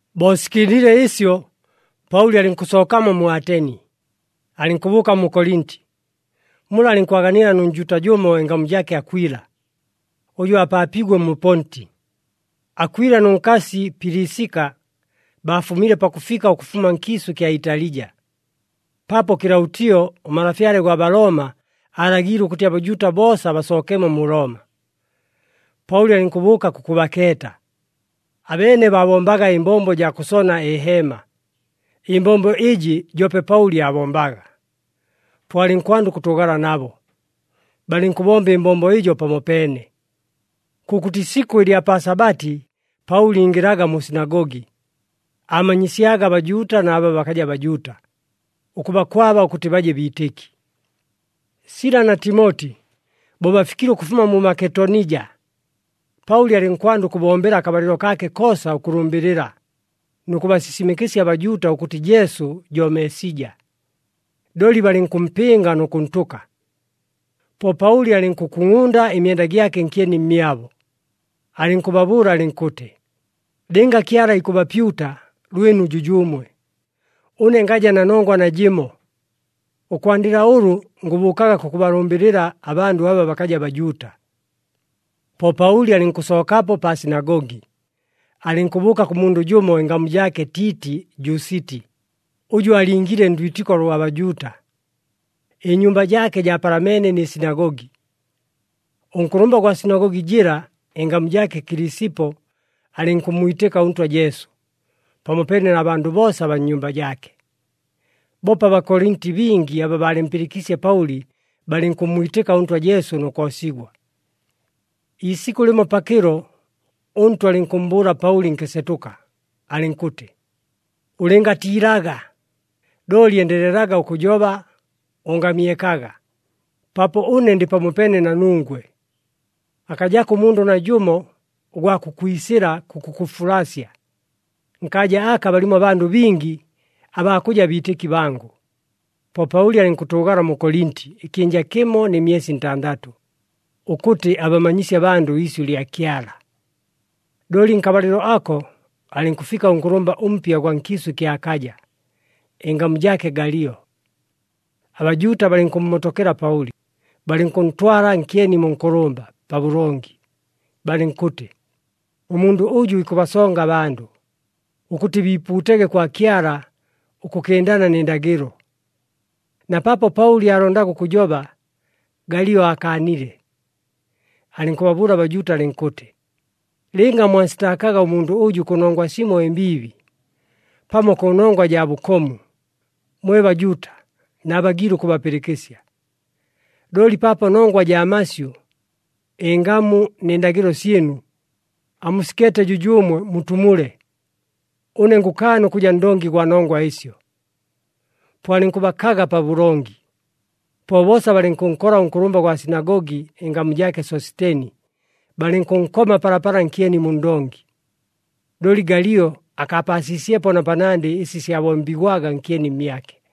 Bo sikɨndile ɨsyo, Paʉli alɨnkʉsookamo mu Ateni, alɨnkʉbʉʉka mu Kolinti. Mula alɨnkwaganila nʉ Njuuta jʉmo ɨngamu jaake Akwila, ʉjʉ aapaapiigwe mu Ponti. Akwila nʉ nkasi Pilisika, baafumile pakʉfika ʉkʉfuma nkiisʉ ɨkya Italija, paapo Kɨlaʉtio ʉmalafyale gwa Balooma aalagiile ʉkʉtɨ aBajuuta boosa basookemo mu Looma. Paʉli alɨnkʉbʉʉka kʉkʉbakeeta. Abeene baabombaga ɨmbombo jaa kʉsona ɨheema, ɨmbombo ɨjɨ joope Paʉli aabombaga. Po alɨnkwanda ʉkʉtʉʉgala nabo, balɨnkʉbomba ɨmbombo ɨjo pamopeene. Kʉkʉtɨ isikʉ ɨlya pa Sabati Paʉli ingɨlaga mu sinagogi, aamanyisyaga aBajuuta na aba bakaja Bajuuta, ʉkʉbakwaba ʉkʉtɨ baje biitɨki. Sila na Timoti bo bafikile ʉkʉfuma mu Maketonija, Paʉli alɨnkwanda ʉkʉbombela akabalɨlo kaake koosa ʉkʉlʉmbɨlɨla nʉ kʉbasisimɨkɨsya aBajuuta ʉkʉtɨ Jesu jo Meesija. Looli balɨnkʉmpɨnga nʉ kʉntʉka. Po Paʉli alɨnkʉkungʼunda ɨmyenda gyake nkyeni mmyabo, alɨnkʉbabʉʉla alɨnkʉtɨ, “Lɨnga Kyala ikʉbapyuta, lwɨnu jʉjʉʉmwe! Ʉne ngaja na nongwa najɨmo. Ʉkwandɨla ʉlʉ ngʉbʉʉkaga kʉkʉbalʉmbɨlɨla abandʉ aba bakaja Bajuuta.” Po Paʉli alɨnkʉsookapo pa sinagogi, alɨnkʉbʉʉka kʉ mundʉ jʉmo ɨngamu jaake Tiiti Jusiti, ʉjʉ aalingiile ndwitɨko lwa Bajuuta, ɨnyumba jaake jaapalameene nɨ sinagogi. Ʉnkʉlʉmba gwa sinagogi jɨla, ɨngamu jaake Kilisipo, alɨnkʉmmwitɨka ʉNtwa Jesu, pamopeene na bandʉ boosa abaa nnyumba jaake. Boope aBakolinti bingi aba baalɨmpɨlɨkiisye Paʉli, balɨnkʉmmwitɨka ʉNtwa Jesu nʉ koosigwa. Iisikʉ lɨmo pakɨlo, ʉNtwa alɨnkʉmmbʉʉla Paʉli nkɨsetʉka alɨnkʉtɨ, “Ʉlɨngatiilaga, looli endelelaga ʉkʉjoba, ʉngamyekaga, paapo ʉne ndɨ pamopeene na nungwe. Akajako ʉmundʉ najʉmo ʉgwa kʉkwisɨla kʉkʉkʉfulasya. Nkaaja aka balimo abandʉ bingi abaa kʉja biitɨki bangʉ.” Po Paʉli alɨnkʉtʉʉgala mu Kolinti ɨkyɨnja kɨmo nɨ myesi ntandatʉ, ʉkʉtɨ abamanyisye abandʉ iisyʉ lya Kyala. Looli nkabalɨlo ako alɨnkʉfika ʉnkʉlʉmba ʉmpya ʉgwa nkiisʉ ɨkya Akaja, ɨngamu jaake Galio. ABajuuta balɨnkʉmmotokela Paʉli, balɨnkʉntwala nkyeni mu nkʉlʉmba, pabʉlongi, balɨnkʉtɨ, “Ʉmundʉ ʉjʉ ikʉbasonga abandʉ, ʉkʉtɨ biipuutege kwa Kyala ʉkʉkɨndana nɨ ndagɨlo.” Na paapo Paʉli aalondaga ʉkʉjoba, Galio aakaanile, alɨnkʉbabʉʉla aBajuuta alɨnkʉtɨ, “Lɨnga mwansitaakaga ʉmundʉ ʉjʉ kʉnongwa simo ɨmbiibi pamo kʉnongwa jaa bʉkomu, mwe Bajuuta naabagiile ʉkʉbapɨlɨkɨsya. Looli paapo nongwa jaa masyʉ, ɨngamu nɨ ndagɨlo syɨnu, amusikeete jʉjʉʉmwe mutumule. Ʉne ngʉkaana ʉkʉja ndongi gwa nongwa ɨsyo!” Po alɨnkʉbakaga pabʉlongi. Po boosa balɨnkʉnkola ʉnkʉlʉmba gwa sinagogi, ɨngamu jaake Sositeni, balɨnkʉnkoma palapala nkyeni mu ndongi. Looli Galio akaapaasiisyepo na panandɨ ɨsi syabombigwaga nkyeni mmyake.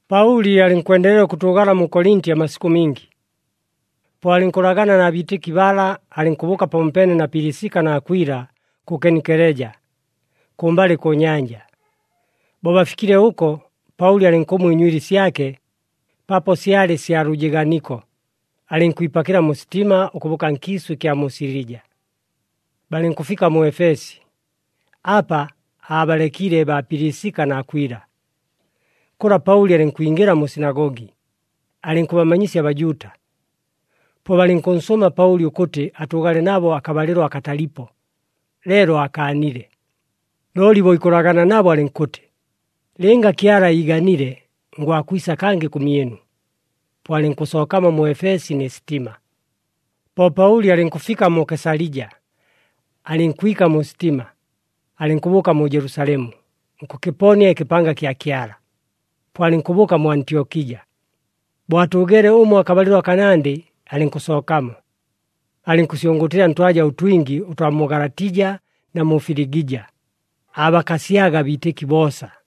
Paʉli alɨnkwendelela ʉkʉtʉʉgala mu Kolinti amasikʉ mingi. Po alɨnkʉlagana na biitɨki bala, alɨnkʉbʉʉka pamopeene na Pilisika na Akwila kʉ Kenkeleja, kʉmbalɨ kʉ nyanja. Bo bafikile ʉko, Paʉli alɨnkʉmwa ɨnywili syake, paapo syalɨ sya lʉjɨɨganiko, alɨnkwipakɨla mu sitima ʉkʉbʉʉka nkiisʉ ɨkya mu Silija. Balɨnkʉfika mu Efesi, apa aabalekile baa Pilisika na Akwila. Kʉla Paʉli alɨnkwingɨla mu sinagogi, alɨnkʉbamanyisya aBajuuta. Po balɨnkʉnsʉʉma Paʉli ʉkʉtɨ atʉʉgale nabo akabalɨlo akatalipo, leelo aakaanile. Looli bo ikʉlagana nabo alɨnkʉtɨ, “Lɨnga Kyala iiganile, ngwakwisa kangɨ kʉmyɨnu.” Po alɨnkʉsookamo mu Efesi nɨ sitima. Po Paʉli alɨnkʉfika mu Kesalija, alɨnkwika mu sitima, alɨnkʉbʉʉka mu Jelusalemu nkʉkɨponia ɨkɨpanga kya Kyala. Po alɨnkʉbʉʉka mu Antyokija. Bo atʉʉgeele ʉmo akabalɨlo akanandɨ, alɨnkʉsookamo. Alɨnkʉsyʉngʉʉtɨla ntwaja ʉtwingi ʉtwa mu Galatija na mu Filigija, aabakasyaga abiitɨki boosa.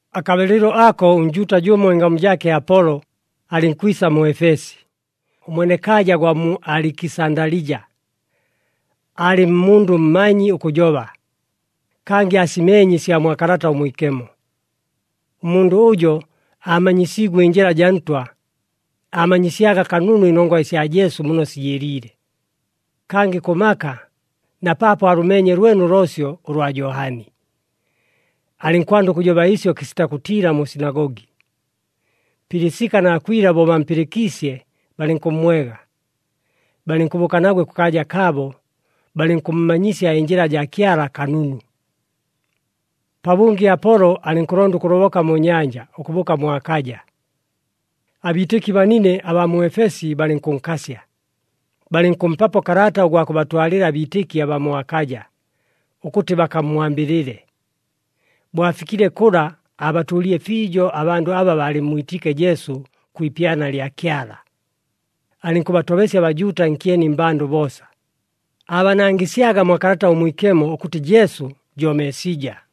Akabalɨlo ako ʉNjuuta jʉmo ɨngamu jaake Apolo alɨnkwisa mu Efesi, ʉmwenekaaja gwa mu Alikisandalija, aalɨ mundʉ mmanyi ʉkʉjoba, kangɨ aasimeenye ɨsya mwa Kalata ʉMwikemo. Ʉmundʉ ʉjo aamanyisiigwe ɨNjɨla jaa Ntwa, aamanyisyaga kanunu ɨnongwa ɨsya Jesu muno sijɨɨliile, kangɨ kʉ maka, na paapo aalʉmeenye lwene ʉloosyo ʉlwa Johani. Alɨnkwanda ʉkʉjoba ɨsyo kɨsita kʉtiila mu sinagogi. Pilisika na Akwila bo bampɨlɨkiisye, balɨnkʉmmwega balɨnkʉbʉʉka nagwe kʉkaaja kaabo, balɨnkʉmmanyisya ɨNjɨla jaa Kyala kanunu. Pabʉngɨ Apolo alɨnkʉlonda ʉkʉloboka mu nyanja ʉkʉbʉʉka mu Akaja. Abiitɨki banine abaa mu Efesi balɨnkʉnkasya, balɨnkʉmpapo kalata ʉgwa kʉbatwalɨla abiitɨki abaa mu Akaja, ʉkʉtɨ bakammwambɨlɨle. Bo afikile kʉla, aabatʉʉlile fiijo abandʉ aba baalɨmmwitiike Jesu kwi ipyana lya Kyala. Alɨnkʉbatobesya aBajuuta nkyeni mmbandʉ boosa, aabanangɨsyaga mwa Kalata ʉMwikemo, ʉkʉtɨ Jesu jo Meesija.